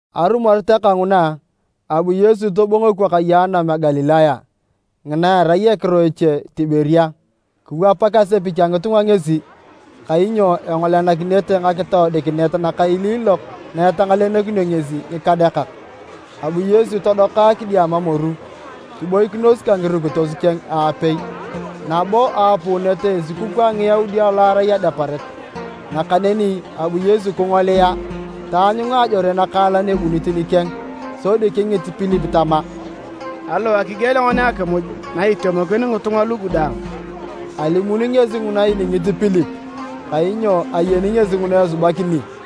Arumoret kanguna, abu Yesu tobongo ekwakaye a anam a Galilaya (ngina erai ekiro eche Tiberia.) Kiwapak asepich a ngitunga ngesi, kainyo engolenakinete ngakitoodikinet nakailiilok na etangalenokinio ngesi ngikadeakak. Abu Yesu todoka kidiama moru kiboikinos ka ngirukitos keng aapei. Nabo aapuunit esukukuu a Ngiyaudi lo arai Adeparet. Nakaneni abu Yesu kingolia, taanyunga ajore nakaalan ebunit nikeng, sodi kingit Pilip tama, “Aliwae kigielea ngoni akimuj na itemokin ngitunga lugu daang?” ( Alimuni ngesi nguna iningit Pilip, kainyo ayeni ngesi nguna esubakini.)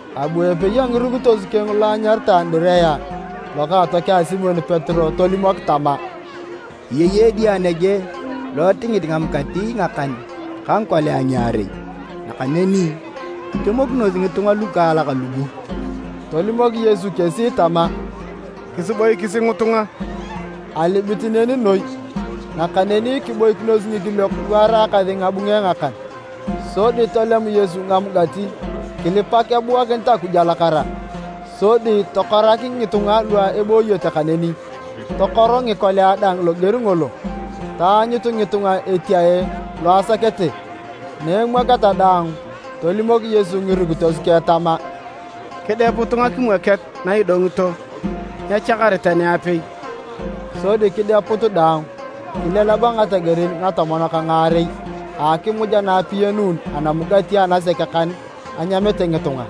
Abu epei a ngirukitos keng lo anyaritae Andirea, lokaatokeng a Simon Petero tolimok tama, “Eyei edia nege lo etingit ngamugati ngakan ka ngikolia ngiarei, nakaneni nyitemokinosi ngitunga lukaalak lugu.” Tolimok Yesu kesi tama, “Kisiboikisi ngitunga.” (Alibit neni noi.) Nakaneni kiboikinos ngikiliok lu araakasi ngabunge ngakan. Sodi tolem Yesu ngamugati, kilipak ebuakinit Akuj alakara, sodi tokorak ngitunga lu ebooyete kaneni. Tokor ngikolia dang loger ngolo, taanyut ngitunga etiae lo asakete. Na emwoketa daang, tolimok Yesu ngirukitos keng tama, “Kideputu ngakimwoket na idongito, nyechakar tani apei.” Sodi kideput daang, kileleba ngategerin ngatomon ka ngaarei a akimuj ana apiyanun anamugati anasek kan anyamete ngitunga.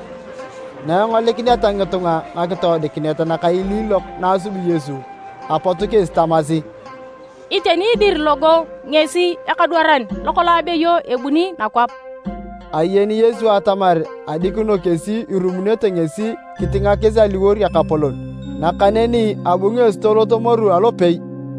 Na engolikineta ngitunga ngakitoodikinet nakailiilok na asubi Yesu, apot kesi tamasi, “Iteni dir logo ngesi ekadwaran lokolong abeyo ebuni nakwap!” Ayeni Yesu atamar adikino kesi irumunete ngesi kitingakis aliwor Ekapolon, nakaneni abu ngesi tolot moru alopei.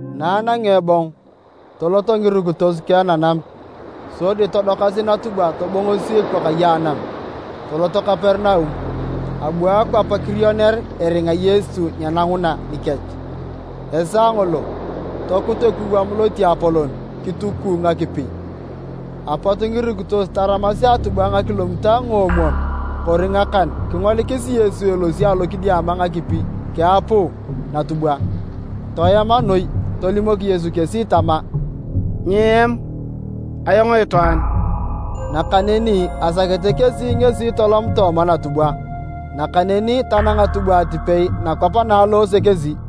Na anangea ebong, toloto ngirukitos keng nanam, sodi todokasi natubwa tobongosi ekwakaye anam toloto Kaperinaum. Abu akwap kirioner eringa Yesu nyenanguna nikech. Esaa ngolo, tokut ekuwam lotiapolon kitukuu ngakipi. Apot ngirukitos taramasi atubwa ngakilomitae ngoomwon kori ngakan kingolikis Yesu elosi alokidiama ngakipi keapuu natubwa. Toema noi. Tolimok Yesu kesi tama, “Nyieam, ayong itwaan!” Nakaneni asakete kesi ngesi tolom tooma natubwa, nakaneni tanang atubwa atipei nakwap na aloose kesi.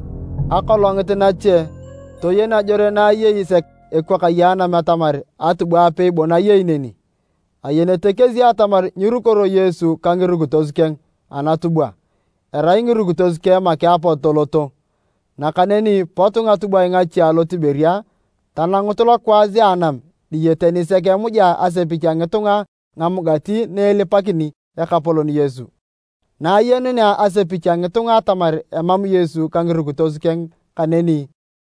Akolongit nache, toyen ajore na ayei sek ekwakaye a anam atamar atubwa apei bon ayei neni. Ayenete kesi atamar nyirukoro Yesu ka ngirukitos keng anatubwa, erai ngirukitos keng make apot toloto. Nakaneni pot ngatubwae ngache alo Tiberia tanangut lokwaas a anam diyete nisek emujea asepich a ngitunga ngamugati naelipakini Ekapolon Yesu. Na ayenunea asepich a ngitunga atamar emam Yesu ka ngirukitos keng kaneni,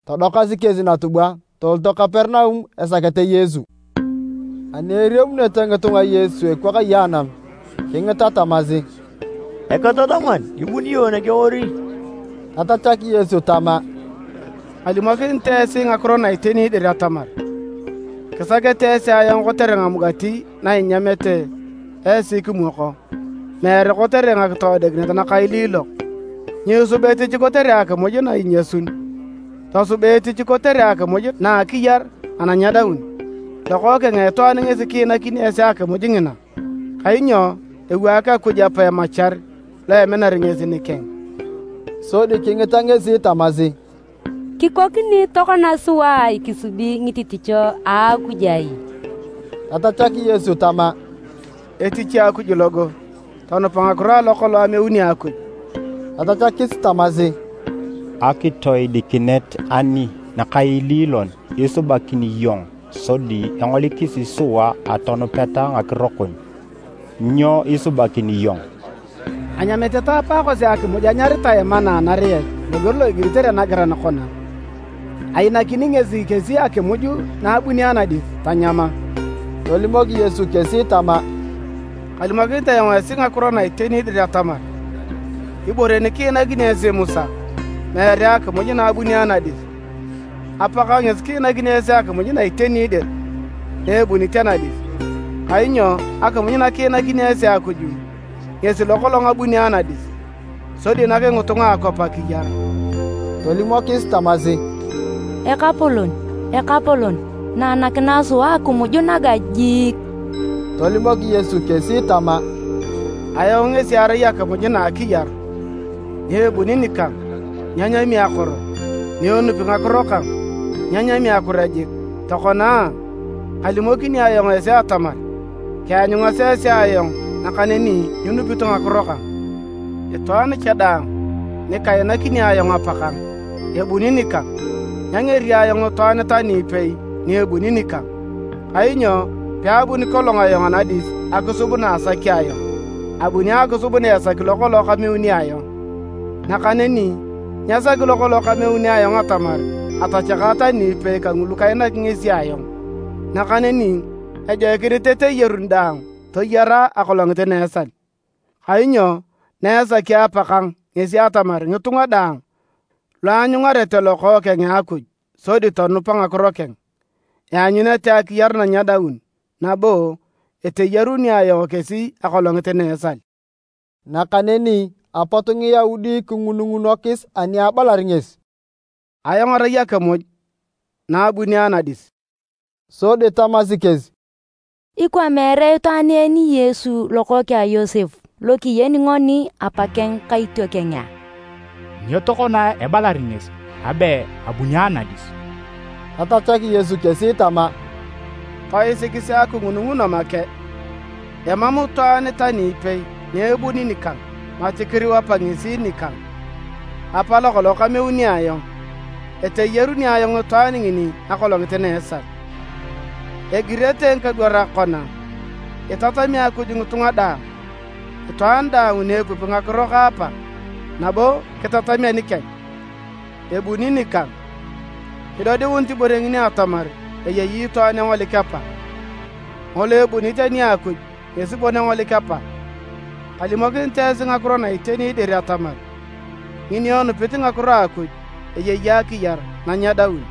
todokasi kesi natubwae toloto Kaperinaum esakete Yesu. Ani eriamunete ngitunga Yesu a ekwakaye anam, kingita tamasi, “Eketataman, ibuni iyong nege ori?” Tatachak Yesu tama, “Kalimokinit esi ngakiro na iteni dir atamar, kisakete esi ayong kotere ngamugati na inyamete esi kimwoko, meere kotere ngakitoodikinet nakailiilok. Nyiisuba etich kotere akimuj na inyasun, tosuba etich kotere akimuj na a akiyar ana nyedaun. Lokookeng a Itwaan ngesi kiinakini esi akimuj ngina, kainyo ewaak Akuj Apa emachar lo eminar ngesi nikeng.” Sodi kingita ngesi tamasi, “Kikoni tokona sua kisubi ngitichisio a Akuj ai?” Tatachak Yesu tama, “Etich a Akuj logo, tonupa ngakiro alo kolong ameuni Akuj.” Tatachakis tamasi, “Akitoodikinet ani nakaililon isubakini iyong sodi engolikisi sua atonupeta ngakiro kon? Nyo isubakini iyong? Anyamete ta apaakosi akimuj anyaritae manna anariet loger lo igiritere nagiran kona, ‘Ainakini ngesi kesi akimuj na abuni anadis tanyama.’” Tolimok Yesu kesi tama, “Kalimokinit ayong esi ngakiro na iteni dir atamar, ‘Ibore nikiinakini esi Musa, meere akimuj na abuni anadis, Apakang ngesi kiinakini esi akimuj na iteni dir naebunit anadis.’ Kainyo akimuj nakiinakini esi Akuj ngesi lokolong abuni anadis, sodi nak ngitunga a akwap akiyar.” Tolimokis tamasi, “Ekapolon, nanakinae sua akimuj naga jiik.” Tolimok Yesu kesi tama, “Ayong ngesi arai akimuj na a akiyar, ni ebuni nikang, nyenyami akoro, ni enupi ngakiro kang, nyenyami akure jik. Tokona a, kalimokini ayong esi atamar, kianyungasi esi ayong nakaneni nyinupito ngakiro kang. Itwaan cha daang nikainakini ayong Apakang, ebuni nikang. Nyangeri ayong itwaan tani ipei ni ebuni nikang, kainyo peabuni kolong ayong anadis akisub na asaki ayong, abuni akisub na esaki lokolong kameuni ayong. Nakaneni nyesaki lokolong kameuni ayong atamar atachaka tani ipei kangulu kainaki ngesi ayong, nakaneni ejoikinit eteyaruni daang toyara akolongit na esal. Kainyo na esaki Apakang ngesi atamar ngitunga daang luanyungarete Lokookeng a Akuj sodi tonupa ngakiro keng, eanyunete akiyar na nyedaun, nabo eteyaruni ayong kesi akolongit na esal.” Nakaneni apot Ngiyaudi kingunungunokis ani abalar ngesi, “Ayong arai akimuj na abuni anadis.” Sodi tamasi kesi, “Ikwa meere itwaan en Yesu lokookeng a Yosep lo kiyeni ngoni apakeng ka itiokeng a? Nyo tokona ebalar ngesi abe abuni anadis?” Tatachak Yesu kesi tama, “Toisikisi akingununguno make. Emam itwaan tani ipei ni ebuni nikang mati kiriu Apa ngesi nikang, Apa lokolong kameuni ayong. Eteyaruni ayong itwaan ngini akolongit na a esal. Egirete ngikadwarak kona, ‘Itatami Akuj ngitunga daang.’ Itwaan daang ni epupi ngakiro ka Apa, nabo kitatami anikeng, ebuni nikang. Nyidodiunit ibore ngini atamar eyei itwaan engolik Apa, ngolo ebunit ani a Akuj ngesi bon engolik Apa. Kalimokinit esi ngakiro na iteni dir atamar, ngini enupit ngakiro a Akuj eyei akiyar na nyedaun.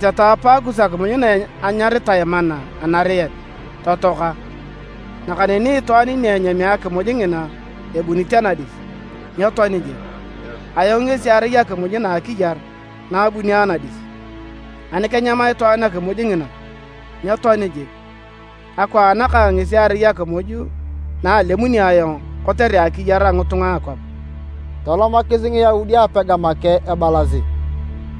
Anyamete ta apaakus akimuj na anyaritae manna anariet, totoaka. Nakaneni itwaan ni enyami akimuj ngina ebunit anadis, nyetoani jik. Ayong ngesi arai akimuj na a akiyar na abuni anadis. Ani kenyam itwaan akimuj ngina, nyetoani jik. Akwaan kang ngesi erai akimuj na alemuni ayong kotere akiyar a ngitunga a akwap.” Tolomakis Ngiyaudi apega make ebalasi,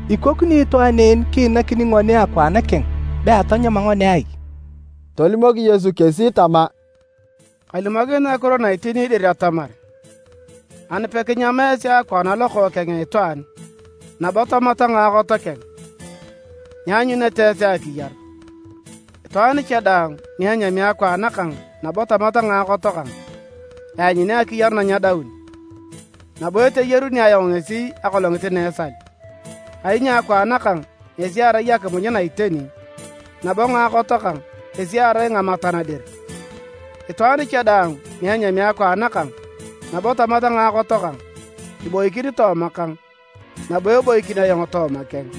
“Ikokini itwaan en kiinakini ngoni akwaan keng be atanyama ngoni ai?” Tolimok Yesu kesi tama, “Kalimokinit ngakiro na iteni dir atamar, ani pekinyam esi akwaan a Lokookeng a Itwaan, nabo tamata ngaakot keng, nyianyunete esi akiyar. Itwaan cha daang ni enyami akwaan kang nabo tamat ngaakot kang, eanyuni akiyar na nyedaun, nabo eteyaruni ayong ngesi akolongit na esal. Kainyo akwaan kang ngesi erai akimuj na iteni, nabo ngaakot kang kesi erai namatan dir. Itwaan cha daang ni enyami akwaan kang, nabo tamat ngaakot kang, iboikin tooma kang, nabo eboikin ayong tooma keng.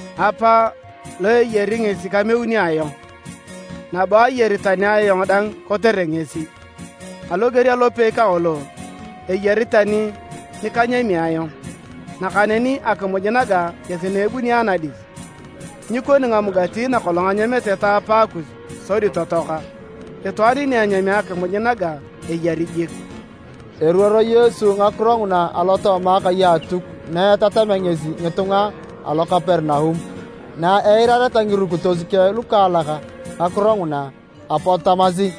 Apa lo eyari ngesi kameuni ayong, nabo ayari tani ayong dang kotere ngesi. Aloger alopei kangolo eyari tani nikanyami ayong. Nakaneni akimuj naga ngesi na abuni anadis, nyikoni ngamugati nakolong anyamete ta apaakus sodi totoaka. Itwaan ni enyami akimuj naga eyari jik.” Eruoro Yesu ngakiro nguna alotooma akai a Atuk na etatamea ngesi ngitunga alo Kaperinaum. Na eirareta ngirukitos keng lukaalak ngakiro nguna, apot tamasi,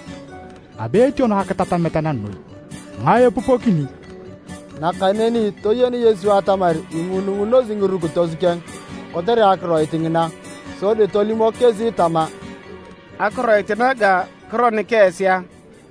“Abe etiono akitatamet na noi. Ngae epupokini?” Nakaneni toyen Yesu atamar ingunungunosi ngirukitos keng kotere akiroit ngina, sodi tolimok kesi tama, “Akiroit naga kironik esi a?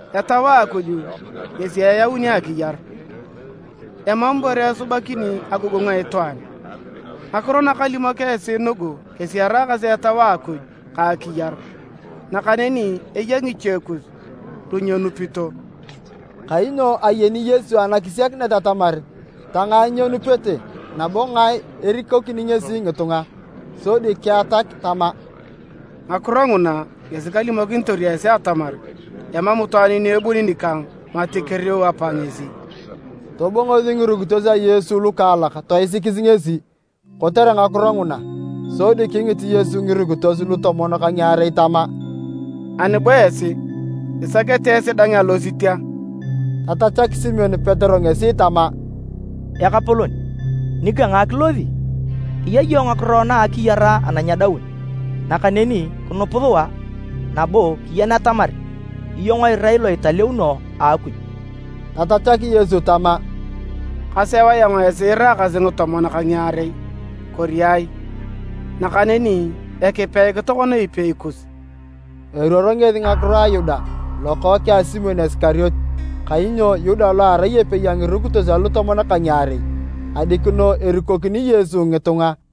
Etau a Akuj ngesi eyauni Akiyar. Emam ibore esubakini agogongu a itwaan. Ngakiro nakalimok esi nugu kesi eraakasi Etau a Akuj ka akiyar. Nakaneni eya ngiche kus lunyenupito.” (Kainyo ayeni Yesu anakisiakinet atamar tangae nyenupete, nabo ngae erikokini ngesi ngitunga.) Sodi keatak tama, “Ngakiro nguna ngesi kalimokinitor esi atamar emam itwaan ni ebuni nikang mati kiriu Apa ngesi.” Tobongosi ngirukitos a Yesu lukaalak toisikis ngesi kotere ngakiro nguna. Sodi kingit Yesu ngirukitos lutomon ka ngiarei tama, “Ani bo esi, isakete esi dang alosit a?” Tatachak Simon Petero ngesi tama, “Ekapolon, nika ngae kilosi? Eya iyong ngakiro na a akiyar ana nyedaun. Nakaneni kinup sua, nabo kiyen atamar iyong irai lo italeuno a Akuj.” Tatachak Yesu tama, “Kaseu ayong esi iraakasi ngitomon ka ngiarei, kori ai? Nakaneni ekipeik tokona epei kus!” Eruoro ngesi ngakiro a Yuda, lokookeng a Simon Isikariote. Kainyo Yuda lo arai epei a ngirukitos alutomon ka ngiarei, adikino erikokini Yesu ngitunga.